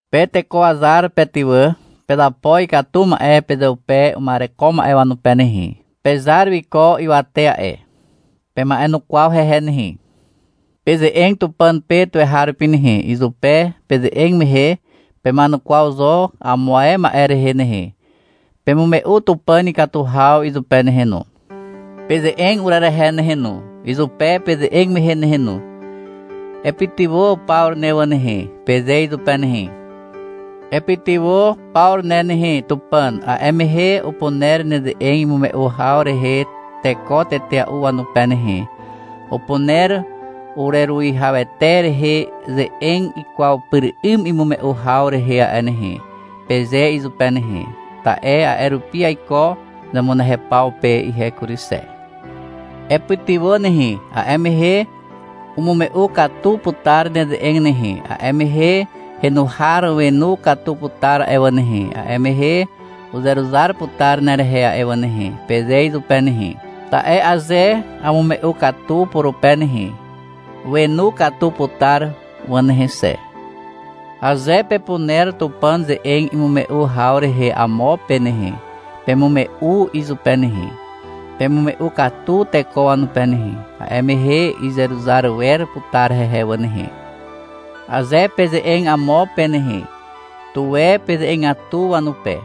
Pe teko wazar pe ty wà, pezapo ikatu ma'e pezeupe uma'ereko ma'e wanupe nehe. Pezar wiko ywate a'e. Pema'enukwaw hehe nehe. Peze'eg Tupàn pe tuweharupi nehe. Izupe peze'eg mehe pema'enukwaw zo amo ae ma'e rehe nehe. Pemume'u Tupàn ikatu haw izupe nehe no. Peze'eg urerehe nehe no, izupe peze'eg mehe nehe no. — Epytywà Pawru ne wà nehe, peze izupe nehe. — Epytywà Pawru ne nehe Tupàn, a'e mehe upuner neze'eg imume'u haw rehe teko tetea'u wanupe nehe, upuner ureruwihawete rehe ze'eg ikwaw pyr 'ym imume'u haw rehe a'e nehe, peze izupe nehe. Ta'e a'e rupi aiko zemunehew paw pe ihe kury xe. — Epytywà nehe, a'e mehe umume'u katu putar neze'eg nehe, a'e mehe henu har wenu katu putar a'e wà nehe, a'e mehe uzeruzar putar nerehe a'e wà nehe, peze izupe nehe. Ta'e aze amume'u katu purupe nehe, wenu katu putar wà nehe xe. Aze pepuner Tupàn ze'eg imume'u haw rehe amo pe nehe, pemume'u izupe nehe. Pemume'u katu teko wanupe nehe, a'e mehe izeruzar wer putar hehe wà nehe. Aze peze'eg amo pe nehe, tuwe peze'egatu wanupe.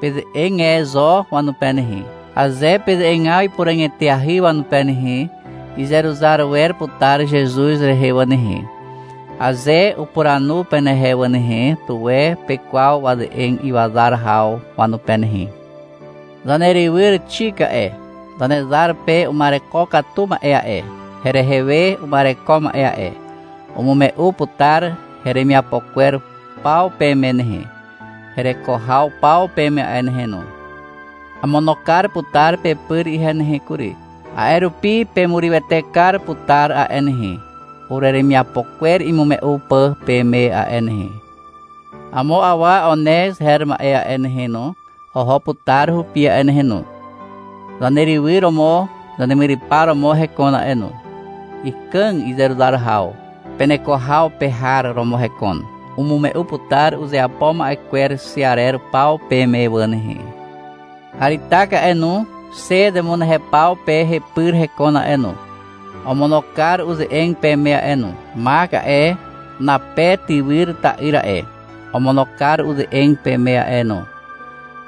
Peze'eg e zo wanupe nehe. Aze peze'egaw ipuràg eteahy wanupe nehe, izeruzar wer putar Zezuz rehe wà nehe. Aze upuranu penehe wà nehe, tuwe pekwaw waze'eg iwazar haw wanupe nehe. Zanerywyr Xik a'e, Zanezar pe uma'ereko katu ma'e a'e, herehe we uma'ereko ma'e a'e, umume'u putar heremiapo kwer paw peme nehe, hereko haw paw peme a'e nehe no. Amono kar putar pepyr ihe nehe kury. A'e rupi pemurywete kar putar a'e nehe, ureremiapo kwer imume'u pà peme a'e nehe. Amo awa Onez her ma'e a'e nehe no, oho putar hupi a'e nehe no. Zanerywyr romo zanemyrypar romo hekon a'e no. Ikàg izeruzar haw. Peneko haw pe har romo hekon. Umume'u putar uzeapo ma'e kwer xe arer paw peme wà nehe. Aritak a'e no, xe zemunehew paw pe hepyr hekon a'e no, omono kar uze'eg peme a'e no. Mak a'e, Nape tywyr ta'yr a'e, omono kar uze'eg peme a'e no.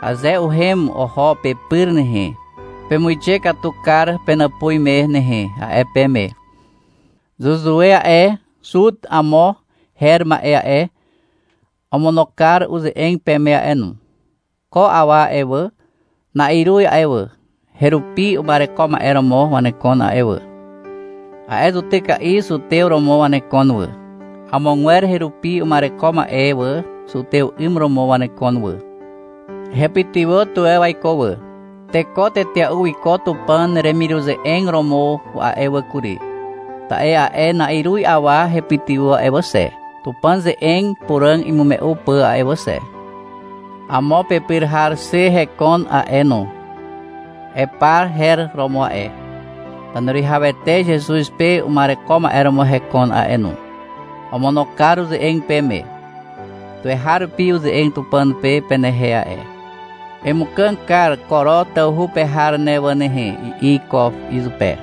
Aze uhem oho pepyr nehe, pemuixe katu kar penàpuz me nehe, a'e peme. Zuzue a'e, (Zut amo her ma'e a'e), omono kar uze'eg peme a'e no. Ko awa a'e wà, na'iruz a'e wà, herupi uma'ereko ma'e romo wanekon a'e wà. A'e zutyka'i zutew romo wanekon wà. Amogwer herupi uma'ereko ma'e wà, zutew 'ym romo wanekon wà. Hepytywà tuwe waiko wà. Teko tetea'u wiko Tupàn remiruze'eg romo a'e wà kury, ta'e a'e na'iruz awa hepytywà a'e wà xe, Tupàn ze'eg puràg imume'u pà a'e wà xe. Amo pepyr har xe hekon a'e no. Epa her romo a'e. Zaneruwihawete Zezuz pe uma'ereko ma'e romo hekon a'e no. Omono kar uze'eg peme. Tuweharupi uze'eg Tupàn pe penehe a'e. — Emukàg kar Koro tawhu pe har ne wà nehe, i'i iko izupe.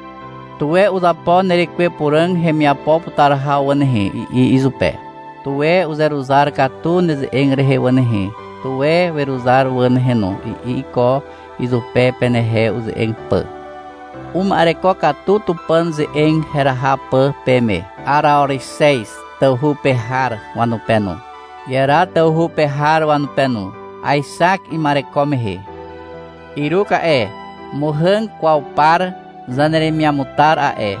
— Tuwe uzapo nerekwe Puràg hemiapo putar haw wà nehe, i'i izupe. — Tuwe uzeruzar katu neze'eg rehe wà nehe, tuwe weruzar wà nehe no, i'i iko izupe, penehe uze'eg pà. Uma'ereko katu Tupàn ze'eg heraha pà peme, Araorixez tawhu pe har wanupe no, Iera tawhu pe har wanupe no. Aexak ima'ereko mehe. Iruk a'e, muhàg kwaw par zaneremiamutar a'e,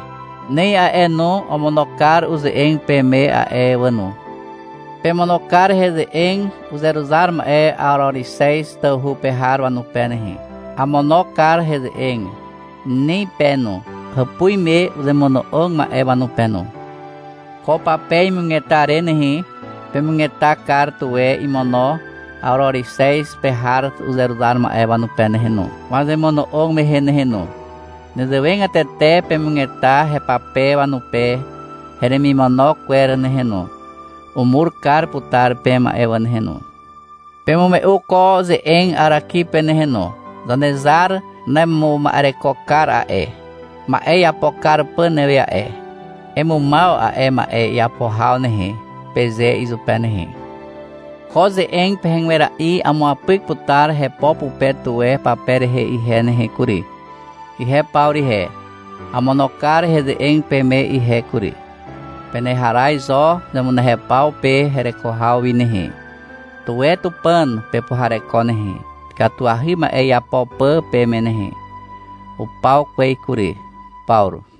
Nem a'e no, omono kar uze'eg peme a'e wà no. Pemono kar heze'eg uzeruzar ma'e Araorixez tawhu pe har wanupe nehe. Amono kar heze'eg Nin pe no, hàpuz me uzemono'og ma'e wanupe no. Ko pape imugeta re nehe, pemugeta kar tuwe imono Araorixez pe har uzeruzar ma'e wanupe nehe no, wazemono'og mehe nehe no. Nezewegatete pemugeta hepape wanupe heremimono kwer nehe no. Umur kar putar peme a'e wà nehe no. Pemume'u ko ze'eg Araki pe nehe no. — Zanezar nemuma'ereko kar a'e, ma'e iapo kar pà newe a'e. Emumaw a'e ma'e iapo haw nehe, peze izupe nehe. Ko ze'eg pehegwera'i amuapyk putar hepo pupe tuwe pape rehe ihe nehe kury. Ihe Pawru ihe, amono kar heze'eg peme ihe kury. Peneharaz zo zemunehew paw pe hereko haw wi nehe. Tuwe Tupàn pepuhareko nehe, ikatuahy ma'e iapo pà peme nehe. Upaw kwez kury. Pawru.